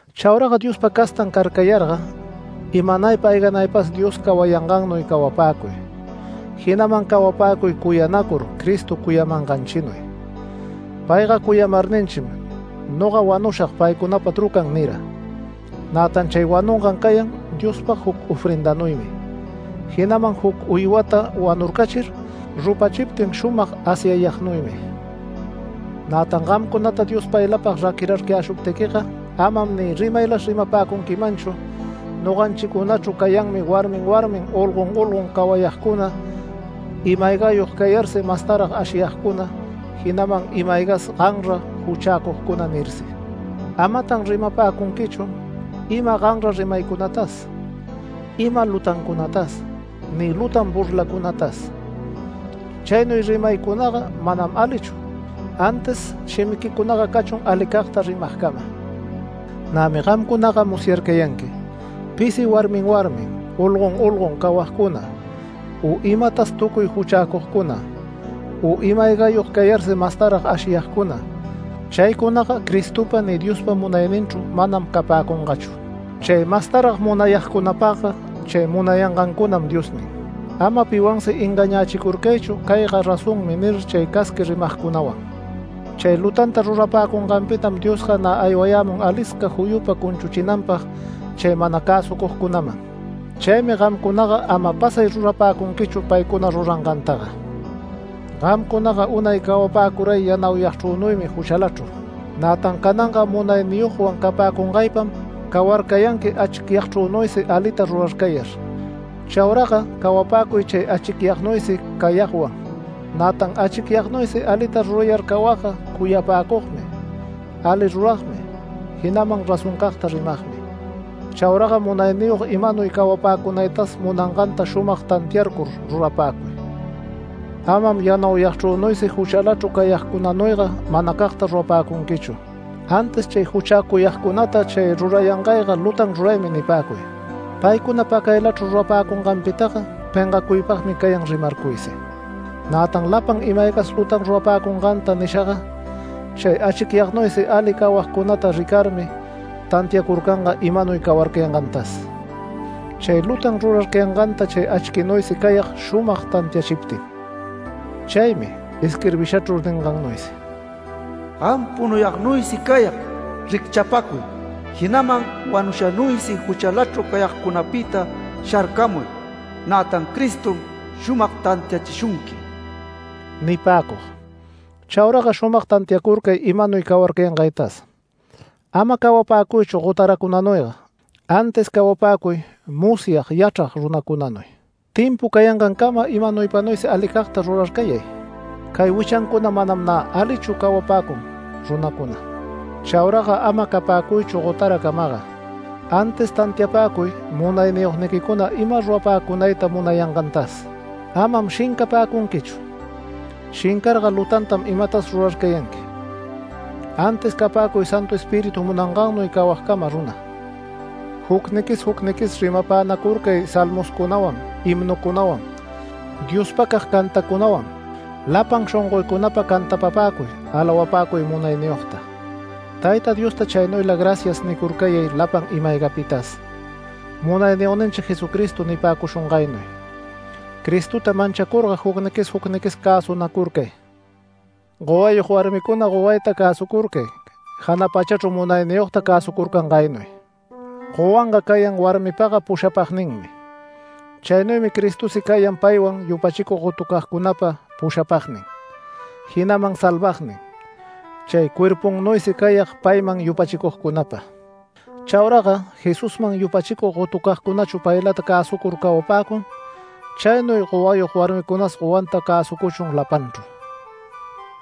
Chauraga Diospa castan carcayarga, imanaypa ayganaypas Dios cawayangannuy cawapäcuy. Jinaman cawapäcuy cuyanacur Cristo cuyamanganchinuy. Payga cuyamarninchim “Noga wanushag paycunapa trucan” nira. Nätan chay wanungan cayan Diospag juc ofrendanuymi, jinaman juc uywata wanurcachir rupachiptin shumag asyayagnuymi. Nätan gamcunata Dios paylapag raquirarcayäshuptiquiga amam ni rimaylas rimapäcunquimanchu: “Noganchicunachru cayanmi warmin warmin, olgon olgon cawayagcuna, ima-aygayog cayarsi mastarag ashiyagcuna, jinaman ima-aygas ganra juchäcugcuna” nirsi. Amatan rimapäcunquichu ima ganra rimaycunatas, ima lutancunatas, ni lutan burlacunatas. Chaynuy rimaycunaga manam alichu, antis shimiquicunaga cachun alicagta rimagcama. Nämi gamcunaga musyarcayanqui pisi, warmin warmin, olgon olgon cawagcuna, u imatas tucuy juchäcugcuna, u ima-aygayog cayarsi mastarag ashiyagcuna, Cristopa ni Diospa munayninchru mana capäcunanta. (Chay mastarag munayagcunapagga chay munayangancunam diosnin.) Ama piwansi engañächicurcaychu “Cayga razonmi” nir chay casqui rimagcunawan. Chay lutanta rurapäcunganpitam Diosga nä aywamun alisca juyupa cunchuchinanpag chay mana cäsucugcunaman. Chaymi gamcunaga ama pasay rurapäcunquichu paycuna rurangantaga. Gamcunaga unay cawapäcuray yanauyagchrünuymi juchalachru. Nätan cananga munayniyogwan capäcungaypam cawarcayanqui achicyagchrünuysi alita rurarcayar. Chauraga cawapäcuy chay achicyagnuysi cayagwan. Nätan achicyagnuysi alita rurayar cawagga cuyapäcugmi, ali ruragmi, jinaman razoncagta rimagmi. Chauraga munayniyog imanuy cawapäcunaytas munanganta shumag tantiarcur rurapäcuy. Amam yanauyagchrünuysi juchalachru cayagcunanuyga manacagta rurapäcunquichu. Antis chay juchäcuyagcunata “Chay rurayangayga lutan ruraymi” nipäcuy. Paycuna pacaylachru rurapäcunganpitaga pengacuypagmi cayan rimarcuysi. Nätan lapan ima-aygas lutan rurapäcunganta nishaga, chay achquinuysi ali cawagcunata ricarmi tantiacurcanga imanuy cawarcayangantas. Chay lutan rurarcayanganta chay achquinuysi cayag shumag tantiachiptin. Chaymi isquirbishachru ningannuysi: “Gam punuyagnuysi cayag, ¡Ricchapäcuy! Jinaman wanushanuysi juchalachru cayagcunapita sharcamuy. Nätan Cristom shumag tantiachishunqui” nipäcug. Chauraga shumag tantiacurcay imanuy cawarcayangaytas. Ama cawapäcuychu gotaracunanuyga, antis cawapäcuy musyag yachrag runacunanuy. Timpu cayangancama imanuypanuysi alicagta rurarcayay. Cay wichancuna manam nä alichu cawapäcun runacuna. Chauraga ama capäcuychu gotaracamaga, antis tantiapäcuy munayniyogniquicuna ima rurapäcunayta munayangantas. Amam shincapäcunquichu. Shincarga lutantam imatas rurarcayanqui, antis capäcuy Santu Espíritu munangannuy cawagcama runa. Jucniquis jucniquis rimapänacurcay Salmoscunawan, himnucunawan, Diospacag cantacunawan. Lapan shongoycunapa cantapapäcuy, alawapäcuy munayniyogta. Tayta Diosta chaynuyla “Gracias” nicurcayay lapan ima-aygapitas, Munayniyogninchi Jesucristo nipäcushungaynuy. Cristota manchacurga jucniquis jucniquis cäsunacurcay. Gowayog warmicuna gowayta cäsucurcay jana pachachru munayniyogta cäsucurcangaynuy. Gowanga cayan warmipaga pushapagninmi. Chaynuymi Cristosi cayan payman yupachicug gotucagcunapa pushapagnin, jinaman salvagnin. Chay cuerpunnuysi cayag payman yupachicugcunapa. Chauraga Jesusman yupachicug gotucagcunachu paylata cäsucur cawapäcun, chaynuy gowayog warmicunas gowanta cäsucuchun lapanchru.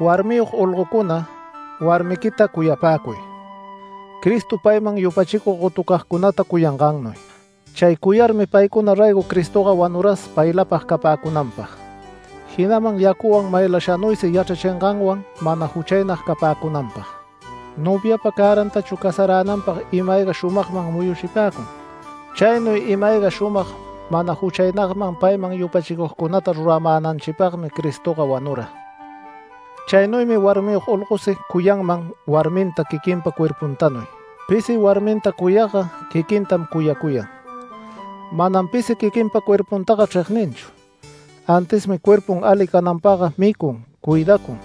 Warmiyog olgocuna, warmiquita cuyapäcuy, Cristo payman yupachicug gotucagcunata cuyangannuy. Chay cuyarmi paycuna raygo Cristoga wanuras, paylapag capäcunanpag, jinaman yacuwan maylashanuysi yachrachinganwan mana juchaynag capäcunanpag. Noviapa cärantachu casaränanpag ima-ayga shumagman muyuchipäcun, chaynuy ima-ayga shumag mana juchaynagman payman yupachicugcunata ruramänanchipagmi Cristoga wanura. Chaynuymi warmiyog olgosi cuyanman warminta quiquinpa cuerpuntanuy. Pisi warminta cuyagga quiquintam cuyacuyan. Manam pisi quiquinpa cuerpuntaga chregninchu, antismi cuerpun ali cananpagga micun, cuidacun.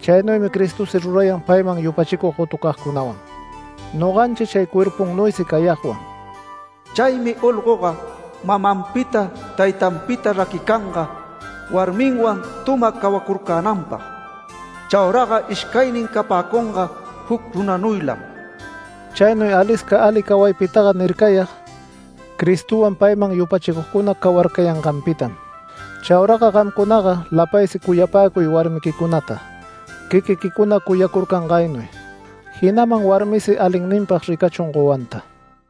Chaynuymi Cristosi rurayan payman yupachicug gotucagcunawan, noganchi chay cuerpunnuysi cayagwan. Chaymi olgoga mamanpita, taytanpita raquicanga, warminwan tuma cawacurcänanpag. Chauraga ishcaynin capäcunga juc runanuylam. Chaynuy alisca ali cawaypitaga nircayag, Cristowan payman yupachicugcuna cawarcayanganpitam. Chaura gamcunaga lapaysi cuyapäcuy warmiquicunata, quiquiquicuna cuyacurcangaynuy, jinaman warmisi alinninpag ricachun gowanta.